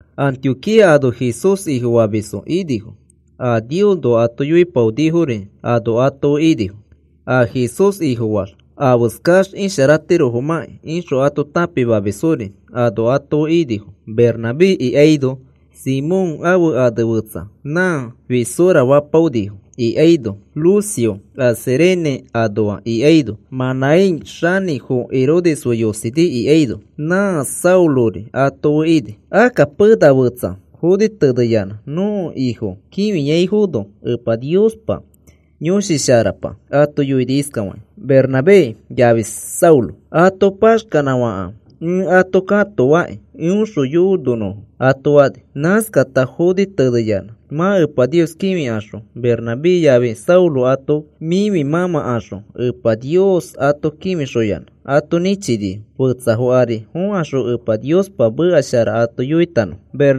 Antioquía ano Jesús Ifofamisfo inifo, a Niosnoa ato yoipaonifori ano ato fe inifo. A Jesús Ifofaax afeskax isharatirofomãkĩ ixõ ato tãpimamisfori ano ato fe inifo. Bernabé ikaino, Simón ãfe ane fetsa Nã Fisora fapaonifo ikaino, Lucio a Cirene anoa ikaino, Manaén xanĩfo Herodes fe yosini ikaino, nã Saulori ato fe ini. Akka pena fetsa foni teneyanã nõko Ifo kĩfiaifono Epa Niospa Yõshi Sharapa ato yoini iskafakĩ: “Bernabé yafi Saulo ato paxkanãfakãfe ẽ ato katoaki eõxõ yononõfo,” ato fani. Nãskata foni teneyanã mã Epa Nios kĩfikaxõ Bernabé yafi Saulo ato mĩfi mãmãkaxõ Epa Nios ato kĩfixoyanã, ato nĩchinifo fetsafo ari fokaxõ Epa Niospa meka shara ato yoitanõfo.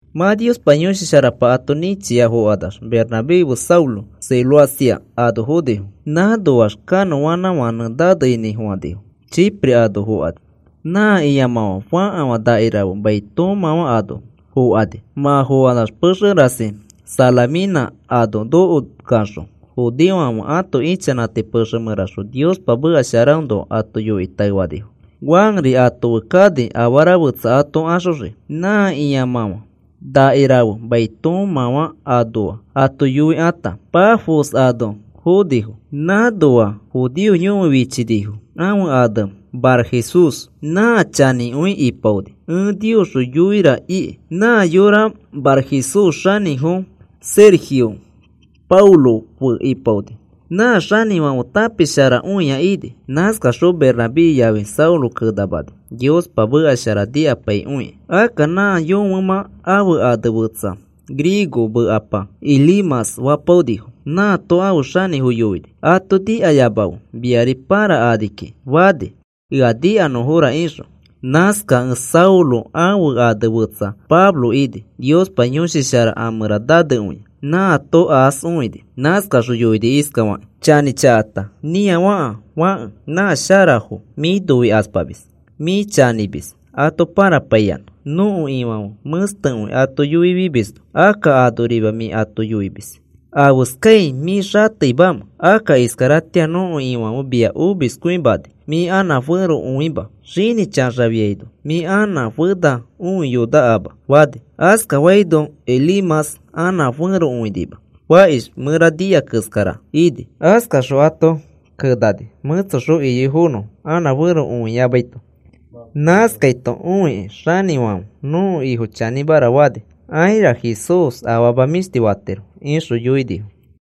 Mã Niospa Yõshi Sharapa ato nĩchia fokanax Bernabé fe Saulo Seleucia ano fonifo. Nãnoax kanõanãfãnẽ nanefainifo Chipre ano fokani. Nã ĩamãfã fakafã nakirafe mai toomãfã ano fokani. Mã fokanax pexe rasi Salamina ano nokokaxõ judeofãfe ãto ichanãti pexe mẽraxõ Niospa meka sharaõnoa ato yoikĩ taefanifo. Juanri ato fe kani afara fetsa ato axoxii. Nã ĩamãfã nakirafe mai toomãfã anoa ato yoikãta, Pafos ano fonifo. Nãnoa judeo yõfe fichinifo ãfe ane Barjesús. Nã chanĩkõi ipaoni ẽ Niosxõ yoira iki. Nã yõfe Barjesús xanĩfo Sergio Paulo fe ipaoni. Nã xanĩfãfe tãpisharakõia ini. Nãskaxõ Bernabé yafi Saulo kenamani, Niospa meka shara nikapaikõiki. Akka nã yõfemã ãfe ane fetsa griego mekapa Elimas fapaonifo. Nãato ãfe xanĩfo yoini: “Ato nikayamafe mia pãrakani kiki,” fani, ea nikanõra ixõ. Nãskakẽ Saulo ãfe ane fetsa Pablo ini. Niospa Yõshi Shara a mẽra nanekõia. Nãato aas õini. Nãskaxõ yoini iskafakĩ: “Chanĩchakapa nĩafaka fake, nã sharafo mĩ noikaspamis. Mĩ chanĩmis ato pãrapaiyanã nõko Ifãfe mẽstekõi ato yoifimisno, akka anorima mĩ ato yoimis. ¿Afeskai mĩ xateimamẽ? Akka iskaratĩa nõko Ifãfe mia omiskõimani. Mĩ anã fẽro õima, xinĩ chaxafiaino mĩ anã fena õiyonakama,” fani. Askafaino Elimas anã fẽro õinima. Fakish mẽra nia keskara ini. Askaxõ ato kenani mẽtsoxõ iyoifonõfo anã fẽro õiyamaito. Nãskaito õikĩ xanĩfãfe nõko Ifo chanĩmara fani. “Aira, Jesús afama mĩshti fatiro,” ixõ yoinifo.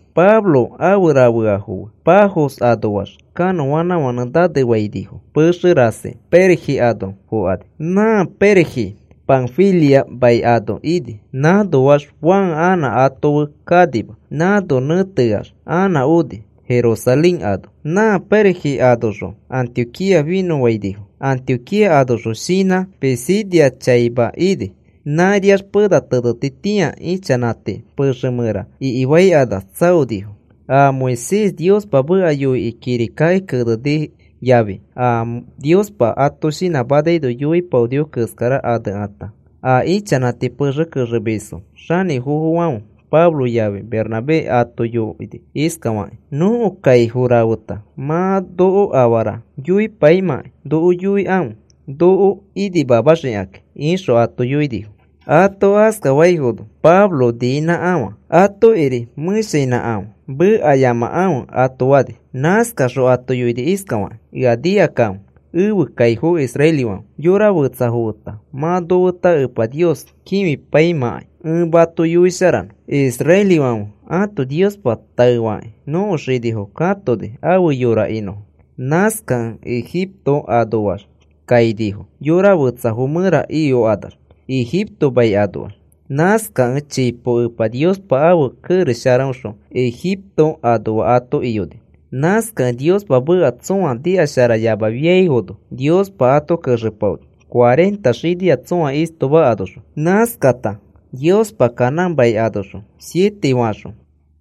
Pablo afe rafeafo fe Pafos anoax kanõanãfãnẽ nanefainifo pexe rasi Perge ano fokani. Nã Perge Panfilia mai ano ini. Nãnoax Juan anã ato fe kanima. Nãno nẽteax anã oni, Jerusalén ano. Nã Perge anoxõ Antioquía finõfainifo, Antioquía anoxõ shinã Pisidia chaima ini. Nãriax pena tenetitĩa ichanãti pexe mẽra ikifaikanax tsaonifo. A Moisés Niospa meka yoikĩ kirikaki keneni yafi a Niospa ato shinãmanaino yoipaonifo keskara anekãta, a ichanãti pexe kexemisfo xanĩfofofãfe Pablo yafi Bernabé ato yoini iskafakakĩ: “Nõko kaifo rafeta mã noko afara yoipaimãkai noko yoikãfe, noko inimamaxikakĩ,” ixõ ato yoinifo. Ato askafaifono Pablo niinãkafã atokiri mẽshainãkafã mekayamakãfe ato fani. Nãskaxõ ato yoini iskafakĩ: “Ea nikakãfe ẽfe kaifo israelifãfe yora fetsafo feta mã nofeta Epa Nios kĩfipaimãkai ẽ mato yoisharanõ. Israelifãfe ãto Niospa taefakĩ nõko xinifo katoni afe yora inõfo. Nãskakẽ Egipto anoax kainifo yora fetsafo mẽra iyokanax Ejipto mai anoax. Nãskakẽ chipo Epa Niospa ãfe kerex sharaõxõ Ejipto anoa ato iyoni. Nãskakẽ Niospa meka tsõa nikasharayamafiaifono, Niospa ato kexepaoni cuarenta xinia tsõa istoma anoxõ. Nãskata Niospa Canaán mai anoxõ siete faxõ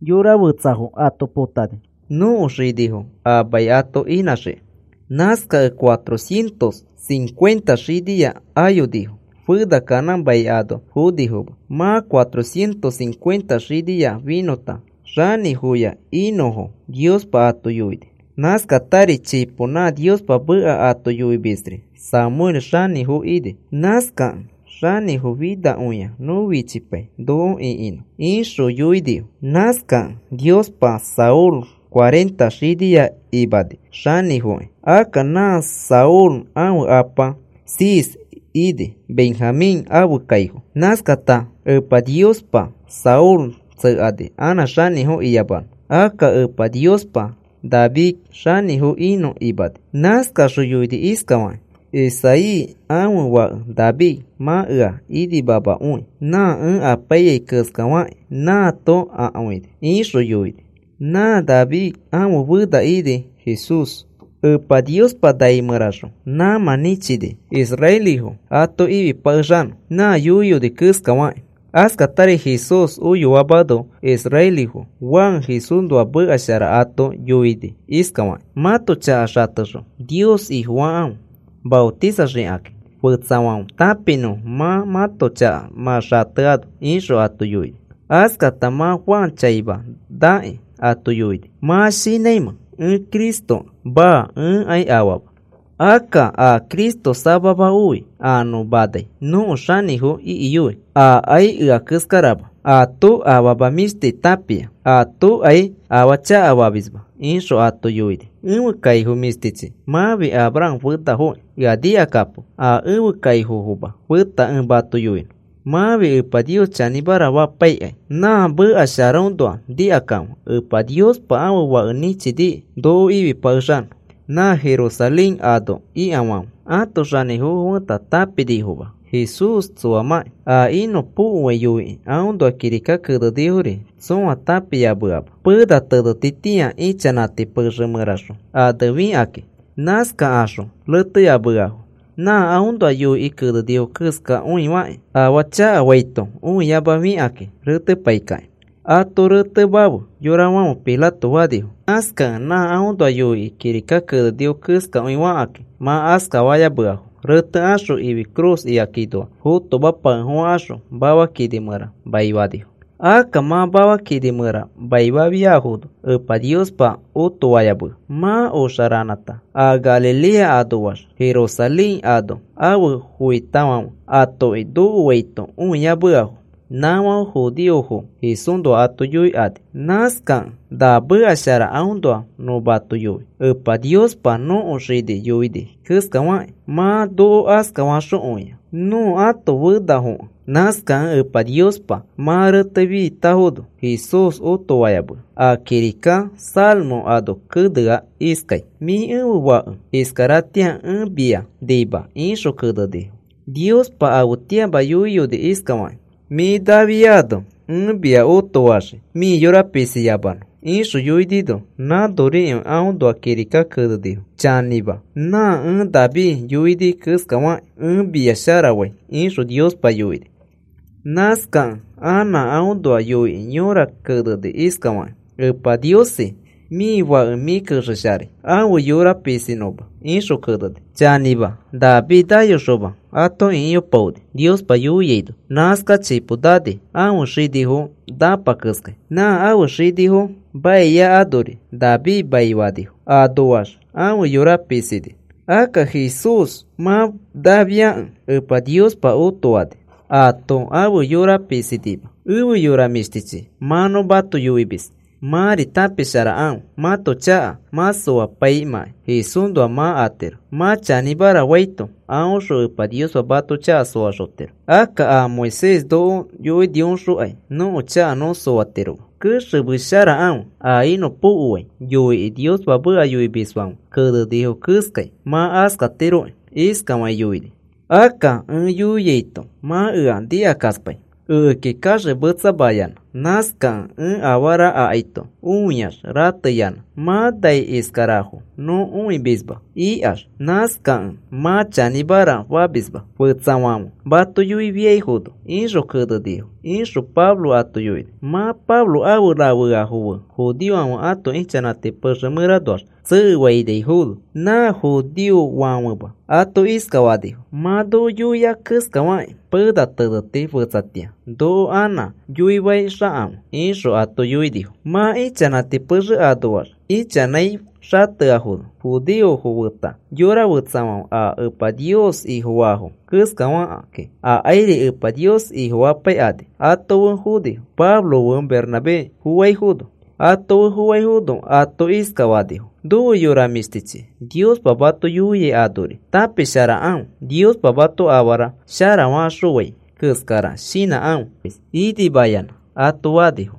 mani fetsafo ato potani, nõko xinifo a mai ato inãxiki. Nãskakẽ cuatrocientos cincuenta xinia ayonifo. Fena Canaán mai ano fonifoma. Mã cuatrocientos cincuenta xinia finõta xanĩfoya inõfo Niospa ato yoini. “Nãskatari chipo nã Niospa meka ato yoimisri Samuel xanĩfo ini. Nãskakẽ, ‘Xanĩfo finakõia nõ fichipai noko ĩkinõ,’ ixõ yoinifo. Nãskakẽ Niospa Saúl cuarenta xinia imani xanĩfokĩ. Akka nã Saúl ãfe apa Cis ini, Benjamín ãfe kaifo. Nãskata Epa Niospa Saúl tsekani anã xanĩfo iyamanõ. Akka Epa Niospa David xanĩfo inõ imani. Nãskaxõ yoini iskafakĩ: ‘Isaí ãfe fãke David mã ea inimamakõi nã ẽ apaiyai keskafaki nãato akõini,’ ixõ yoini. Nã David ãfe fena ini Jesús. Epa Niospa nai mẽraxõ nãmã nĩchini israelifo ato ifipakexanõ nã yoiyoni keskafakĩ. Askatari Jesús oyoamano israelifo Juan Jesúsnoa meka shara ato yoini iskafakĩ: ‘Mãto chaka xatexõ Nios Ifofakãfe maotisaxakakĩ fetsafãfe tãpinõfo mã mãto chaka mã xateano,’ ixõ ato yoini. Askata mã Juan chaima nakĩ, ato yoini: ‘¿Mã shinãimẽ ẽ Cristokẽ? Maa, ẽkai aama. Akka a Cristo samama oi a nõ manai nõko xanĩfo ikiyoi. Akai ea keskarama. Ato afama mĩshti tãpia. Atokai afaa chakafamisma,’ ixõ ato yoini. “Ẽfe kaifo mĩshtichi, mãfi Abraham fenafokĩ, ea nikakapo a ẽfe kaifomafo feta ẽ mato yoinõ. Mãfi Epa Nios chanĩmara fapaikai. Nã meka sharaõnoa nikakãfe Epa Niospa ãfe Fake nĩchiniki noko ifipakexanõ. Nã Jerusalén ano ikafãfe ãto xanĩfofo feta tãpinifoma Jesús tsoamãki. A inõpokoai yoikĩ aõnoa kirika kenenifori tsõa tãpiyameama, pena tenetitĩa ichanãti pexe mẽraxõ anefikakĩ. Nãskakaxõ reteyameafo nã aõnoa yoikĩ kenenifo keskakõifakĩ. Afaa chakafaito õiyamafikakĩ retepaikakĩ. ‘Ato retemafe,’ yorafãfe Pilato fanifo. Nãskakẽ nã aõnoa yoikĩ kirika kenenifo keskakõifakĩ, mã askafayameafo retekaxõ ifi cruz ikakinoa fotomapakefofãkaxõ mafa kini mẽra maifanifo. Akka mã mafa kini mẽra maifafiafono Epa Niospa otofayamea. Mã oxa ranãta a Galilea anoax Jerusalén ano afe foitafãfe atoki nokoaito õiyameafo. Nãfãfe judeofo Jesúsnoa ato yoikani. “Nãskakẽ na meka shara aõnoa nõ mato yoi, Epa Niospa nõko xinifo yoini keskafakĩ. Mã noko askafaxokõia nõ ãto fenafokẽ. Nãskakẽ Epa Niospa mã retefitafono Jesús otoayamea. A kirika Salmo ano kenea iskai: Mĩ ẽfe Fake. Iskaratĩa ẽ mia nima, ixõ kenenifo. Niospa afetĩama yoiyoni iskafakĩ: Mĩ nafiano ẽ mia otofaxii mĩ yora pisiyamanõ, ixõ yoinino, nãnorikõi aõnoa kirika kenenifo: Chanĩma, nã ẽ David yoini keskafakĩ ẽ mia sharafai, ixõ Niospa yoini. Nãskakẽ ana aõnoa yoikĩ yõra keneni iskafakĩ: Epa Niosi, mĩ Fake mĩ kexesharai ãfe yora pisinõma, ixõ keneni. Chanĩma, David nayoxoma ato ĩkiyopaoni, Niospa yoiaino. Nãskax chipo nani ãfe xinifo nãpa keskai, nã ãfe xinifo mai anori David maifanifo. Anoax ãfe yora pisini. Akka Jesús mã nafiakẽ Epa Niospa otoani. Ato ãfe yora pisinima. Efe yora mĩshtichi, mã nõ mato yoimis mãri tãpisharakãfe, mãto chaka mã soapaimãkai Jesúsxõ mã atiro. Mã chanĩmara faito aõxõ Epa Niospa mato chaka soaxotiro. Akka a Moisés noko yoinioxõkai nõko chaka nõ soatiroma. Kexemesharakãfe a inõpokoai yoikĩ Niospa meka yoimisfãfe kenenifo keskai mã askatiroki. Iskafakĩ yoinifo: Akka ẽ yoiaito mã ea nikakaspai, ekeki kaxemetsamayanã. Nãskakẽ ẽ afarafo akaito õiax rateyanã mã nai iskarafo nõ õimisma ikax. Nãskakẽ mã chanĩmara famisma, fetsafãfe mato yoifiaifono, ixõ kenenifo,” ixõ Pablo ato yoini. Mã Pablo afe rafeafo fe judeofãfe ãto ichanãti pexe mẽranoax tsekefainaifono, nã judeofofãfema ato iskafanifo: “Mã noko yoia keskafakĩ pena teneti fetsatĩa noko anã yoifaixakãfe,” ixõ ato yoinifo. Mã ichanãti pexe anoax ichanãi xateafono, judeofo feta yora fetsafãfe a Epa Nios Ifofaafo keskafakĩ akairi Epa Nios Ifofapaikani ato fe fonifo, Pablo fe Bernabé foaifono. ato fe foaifono ato iskafanifo: “Nofe yora mĩshtichi, Niospa mato yoiai anori tãpisharakãfe. Niospa mato afara sharafaxõfai keskara shinãkãfe inimayanã,” ato fanifo.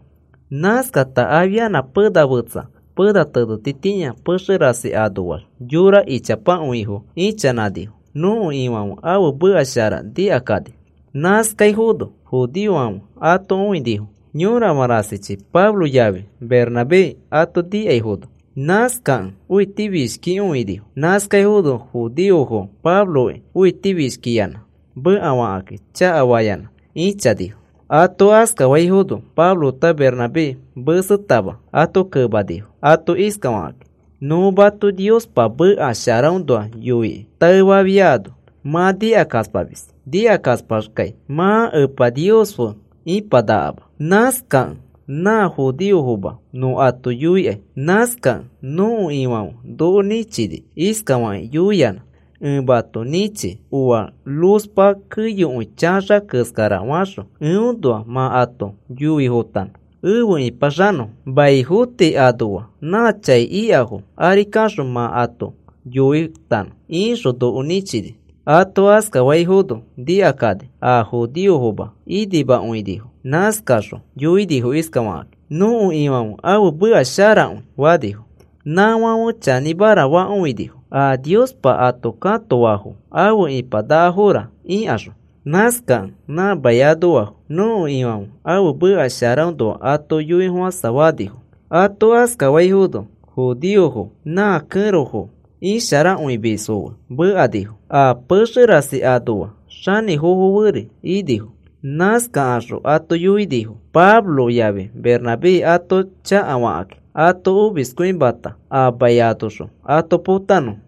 Nãskata afianã pena fetsa pena tenetitĩa, pexe rasi anoax yora ichapakõifo ichanãnifo nõko Ifãfe ãfe meka shara nikakani. Nãskaifono judeofãfe ato õinifo yõrafã rasichi Pablo yafi Bernabé ato nikaifono. Nãskakẽ õitifishkikõinifo. Nãskaifono judeofo Pabloki õitifishkiyanã mekafakĩ chakafayanã ĩchanifo. Ato askafaifono Pablo feta Bernabé mesetama ato kemanifo ato iskafakakĩ: “Nõ mato Niospa meka sharaõnoa yoikĩ taefafiaino, mã nikakaspamis. Nikakaspaxkai mã Epa Nios fe ĩpanakama. Nãskakẽ nã judeofoma nõ ato yoikai. Nãskakẽ nõko Ifãfe noko nĩchini iskafakĩ yoiyanã: Ẽ mato nĩchi oa luzpa keyokõi chaxa keskara faxõ, eõnoa mã ato yoifotanõ, efe ĩpaxanõfo. Maifo tii anoa na chai ikafo ari kaxõ mã ato yoitanõ,” ixõ noko nĩchini. Ato askafaifono nikakani, a judeofoma inimakõinifo. Nãskaxõ yoinifo iskafakakĩ: “Nõko Ifãfe ãfe meka sharakõi,” fanifo. Nãfãfe chanĩmara fakõinifo a Niospa ato katoafo afe ipanakafora ikaxõ. Nãskakẽ nã mai anoafo, nõko Ifãfe ãfe meka sharaõnoa ato yoifofãsafanifo. Ato askafaifono judeofo nã kẽrofo isharakõimisfo fe mekanifo, a pexe rasi anoa xanĩfofo feri inifo. Nãskakaxõ ato yoinifo Pablo yafi Bernabé ato chakafakĩ ato omiskõimata a mai anoxõ ato potanõfo.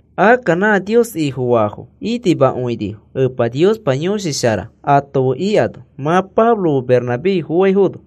Akka nã Nios Ifofaafo inimakõinifo, Epa Niospa Yõshi Shara ato fe ikano, mã Pablo fe Bernabé foaifono.